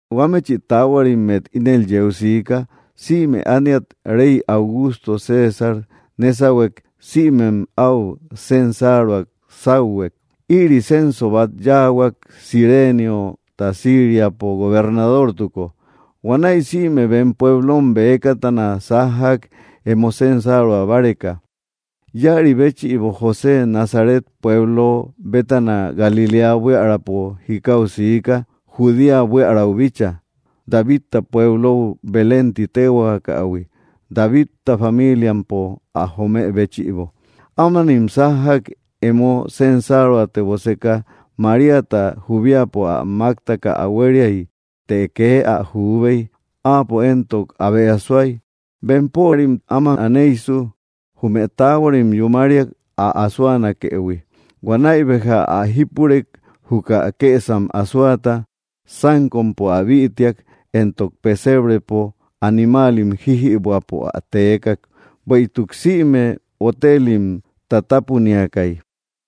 Huamechï taahuarimmet ínel yeu siika sïme ániat rey Augusto César nésahuek sïmem áu censaruak sáuhuek. Ïri censo bat yáahuak Cireniota Síriapo gobernadortuko. Huanäi sïme bem pueblom bëkatana sájjak emo censarua báreka. Ïaribéchïbo, José Nazaret pueblo bétana Galiléa buiärapo jikau siika, Judea buiaräu bíchaa, Davidta pueblou Belén ti téhuaakähui, Davidta familiampo ä jomë béchïbo. Ámanim sájjak, emo censaruateboseka. Maríata juubiapo ä máktaka ä huériay, të kee ä juubey, áapo éntok abe asoay. Bempörim áma aneysu jume taahuarim yúmariak, ä asoanakëhui. Huanäi béja ä jípurek, juka kësam asoata, sánkompo ä bïtiak. Éntok pesebrepo animaalim jíjïbuäpo ä teekak. Bueïtuk sïme hotelim tátapuniakay.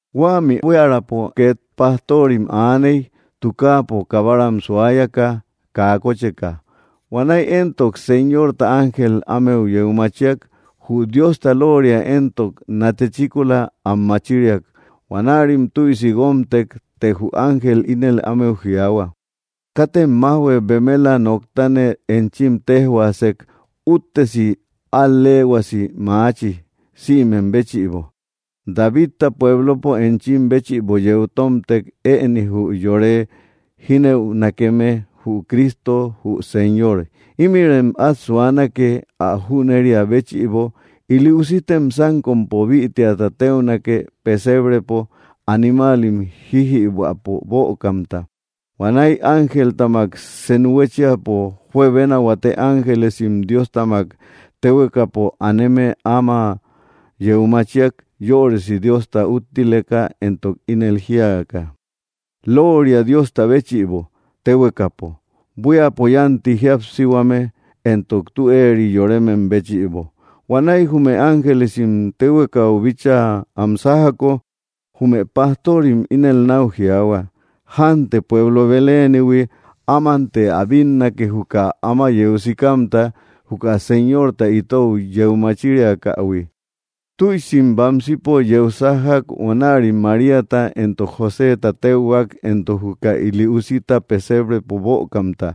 Huämi buiärapo két pastorim aaney, tukaapo kabaram suayaka, kaa kocheka. Huanäi éntok Señorta ángel ámeu yeu machiak. Jü Diosta lóoria éntok natechíkola, am machiriak. Huanärim tüisi guómtek. Të jü ángel ínel ámeu jiaahua: —Katem májhue, bemela tü noktane enchim téjhuaasek, úttesi al‑leehuasi maachi, sïmem béchïbo. Davidta pueblopo, enchim béchïbo yeu tómtek, ëni, jü yore jínëunakeme, jü CRISTO jü Señor. Ímïrem át suanake, ä jüneria béchïbo: Ili usitem sánkompo bïtiata téunake, pesebrepo animaalim jíjïbuäpo bökamta. Huanäi ángeltamak senu huéchiapo juebena huate ángelesim, Diostamak téhuekapo aneme, áma yeu machiak, yörisi Diosta úttileka éntok ínel jíaka: ¡Looria Diosta béchïbo téhuekapo! ¡Buíapo yánti jíapsihuame, entok tü eeri yoremem béchïbo! Huanäi jume ángelesim téhuekau bíchaa am sájjako. Jume pastorim ínel náu jiaahua: —Jánte pueblo Belénihui, ámante ä bínnake juka áma yeu sikamta, juka Señorta itou yeu machiriakähui. Tüisim bamsipo yeu sájjak. Huanärim Maríata éntok Joséta téuhuak, éntok juka ili usita pesebrepo bökamta.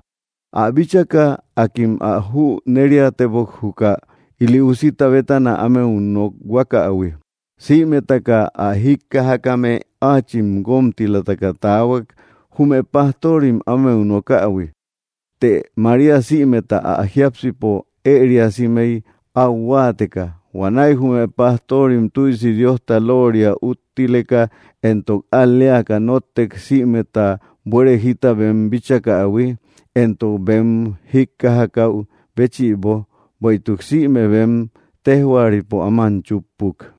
Ä bíchaka, akim ä jüneriatebok, juka ili usita bétana ámeu nokhuakähui. Sïmetaka ä jíkkajakame áachim guómtilataka taahuak, jume pastorim ámeu nokähui. Të María sïmeta ä jiápsipo ëriasimey, áu huáateka. Huanäi jume pastorim tüisi Diosta looria úttileka entok al‑leaka nóttek sïmeta buere jita bem bíchakähui, éntok bem jíkkajakäu béchïbo, bueïtuk sïme bem téjhuaripo áman chúppuk.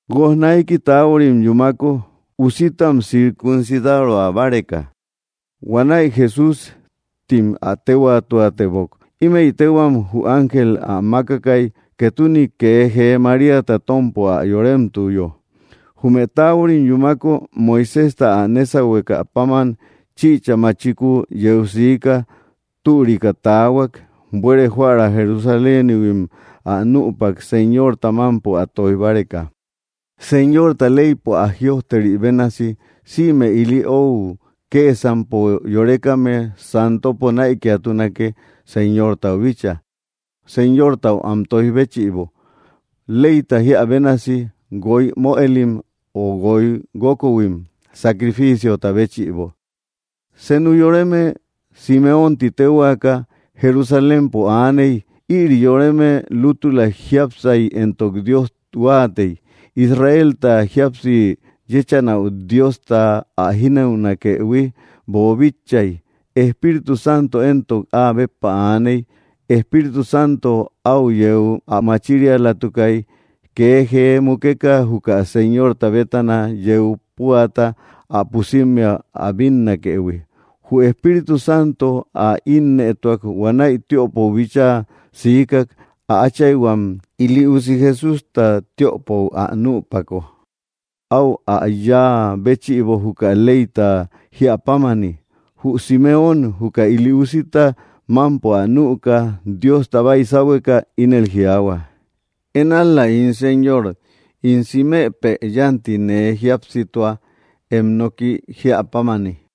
Guoj naiki taahuarim yúmako, usitam circuncidaroa báreka. Huanäi Jesús tim ä téhuaatebok. Ímëi téhuam jü ángel ä mákakay, ketune kee jee Maríata tómpo ä yoremtuyo. Jume taahuarim yúmako, Moiséjta ä nésahuekä páman chichä machiku yeu sika türika tahuak, buere joära Jerusalénihuim ä nüpak, Señorta mámpo ä tóij báreka. Señorta leypo ä jïojteri bénasi: “Sïme ili ou kësampo yorekame, Santopo näikiatunake Señortau bíchaa.” Señortau am toij béchïbo, leyta jíä bénasi, guoy möelim o guoy guókohuim, sacrificiota béchïbo. Senu yoreme, Simeón ti téhuaaka, Jerusalémpo aaney. Ïri yoreme lútüla jiápsay, éntok Dios huáatey. Israelta jíapsi yechanäu Diosta ä jínëunakëhui boobíchaïhuiy. Espíritu Santo éntok áa béppa aaney. Espíritu Santo au yeu ä machirialatukay, kee jee mukeka juka Señorta bétana yeu púata, ä pusimmea ä bínnakëhui. Jü Espíritu Santo ä innëtuak, huanäi tiöpou bíchaa sika. Ä áchayhuam ili usi Jesústa tiöpou ä nüpako, aú ä yá béchïbo juka leyta jiapámani. Jü Simeón, juka ili usita mámpo ä nüka, Diosta baysahueka, ínel jiaahua: Én ál‑la, ín Señor, ín simepë. Yanti nee jíapsitua, em noki jíäpámani,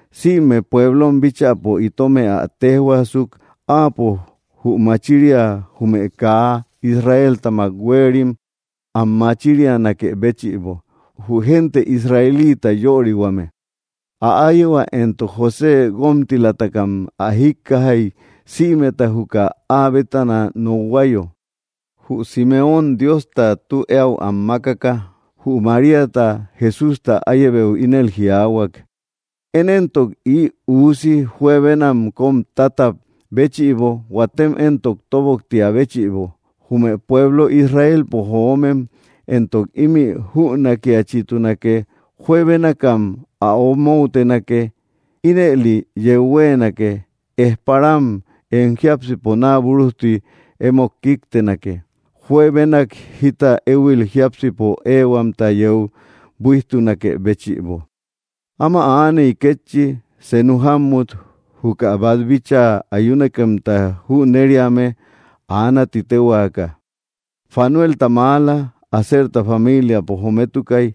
Sïme pueblom bíchäpo, itomë ä téjhuaasuk: Áapo jü machiria, jume kaa Israeltamak huéerim, am machirianakë béchïbo, jü gente Israelita yorihuame. Ä áyehua éntok José, guómtilatakam ä jíkkajay, sïmeta júkäi áa bétana nokhuayo. Jü Simeón Diosta tu eäu am makkaka. Jü Maríata, Jesústa áyebeu, ínel jiaahuak: —Én éntok ï usi juebenam kóm tátab béchïbo, huatem éntok tóboktiä béchïbo, jume pueblo Israelpo joomem. Éntok ímï jünakiachitunake: juebénakam ä omoutenake. Ínëli yeu huéenake: ejparam em jiápsipo naa búrujti emót kíktenake. Juebenak jita éhuil jiápsipo éehuamta yeu buíjtunakë béchïbo. Ama aaney, kétchi, senu jámmut, juka bát bíchaa ayunakemta jüneriame. Aana ti téhuaaka, Fanuelta maala, Aserta familiapo jometukay.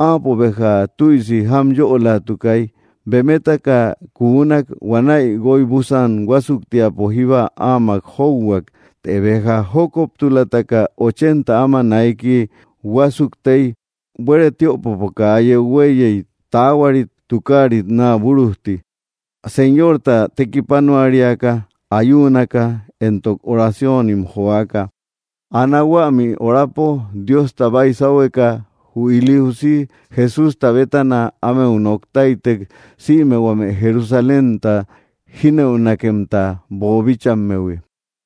Áapo béja tüisi jámyölatukay. Bemetaka kunak huanay guoy búsan huásuktiapo jíba amak jouhuak. Të béja jókoptulataka ochenta áma naiki huásuktey. Buere tiöpopo kaa yeu huéiyey, taahuarit tukaarit naa búrujti, Señorta tekipanuariaka, ayuunaka éntok oracionim joaka. Ana huämi horapo, Diosta baysahueka, jü ili usi Jesústa bétana ámeu nok táytek, sïme huame Jerusalénta jínëunakemta boobíchaïhuimmehui.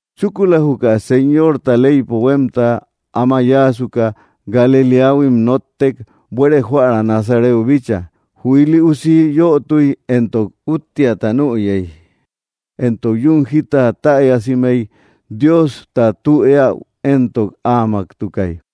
Chúkula juka Señorta leypo huémta áma yáasuka, Galiléahuim nóttek, buere joära Nazareu bíchaa. Jü ili usi yötuy, éntok úttiata nüyey, éntok yún jita täyasimey. Diosta tü eäu éntok áamaktukay.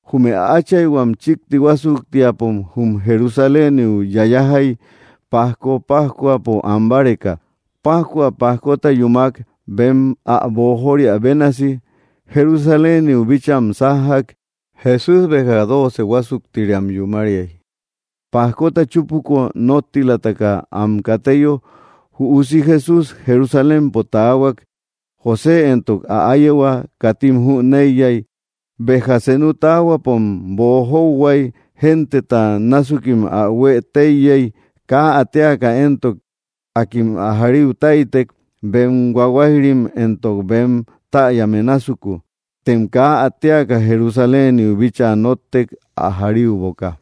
Jume ä áchayhuam chíkti huásuktiapom jum Jerusaléniu yayajay pajko pájcuapo an báreka. Pájcua pajkota yúmak, bem ä boojoria bénasi, Jerusaléniu bícham sájjak. Jesús béja dooce huásuktiriam yúmariay. Pajkota chúpuko, nottilataka am kateyo, jü usi Jesús Jerusalémpo taahuak. José éntok ä áyehua katim jüneiyay. Béja senu taahuapom boojouhuay, genteta násukim ä huë téiyey. Kaa ä téaka éntok, akim ä jariu táytek, bem huahuayrim éntok bem täyame násuku, tem kaa ä téaka, Jerusaléniu bíchaa nóttek, ä jariuboka.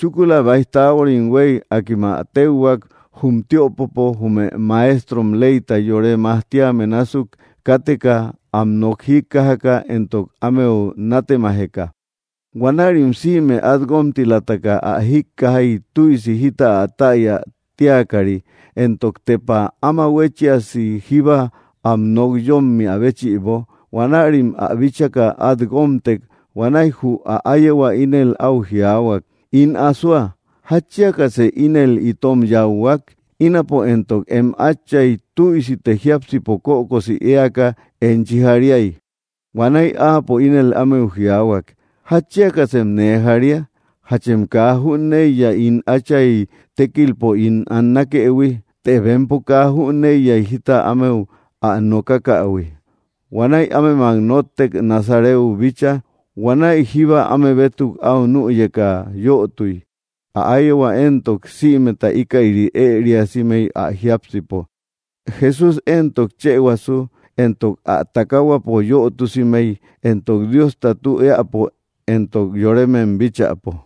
Chúkula báij taahuarim huéy, akim ä téuhuak jum tiöpopo, jume maestrom leyta yore majtíame násuk káteka, am nok jíkkajaka éntok ámeu nátemajeka. Huanärim sïme át guómtilataka ä jíkkajay tüisi jita ä täya tíakari, éntok tepa áma huéchiasi jíba am nok yómmiä béchïbo. Huanärim ä bíchaka, át guómtek. Huanäi jü ä áyehua ínel áu jiaahuak: —In asoa, ¿jatchiakasë ínel itom yáuhuak? Ínapo, éntok em áchay, tüisite jiápsipo kökosi éaka enchi jariay. Huanäi áapo ínel ámeu jiaahuak: —¿Jatchiakasem nee jaria? ¿Jachem kaa jüneiya ín Átchay tékilpo ín annakëhui? Të bempo kaa jüneiyay jita ámeu ä nokakähui. Huanäi ámemak nóttek, Nazareu bíchaa. Huanäi jíba áme bétuk áu nüyeka yötuy. Ä áyehua éntok, sïmeta íkäri ëriasimey ä jiápsipo. Jesús éntok chëhuasu entok ä takahuapo yötusimey, entok Diosta tü eäpo entok yoremem bíchäpo.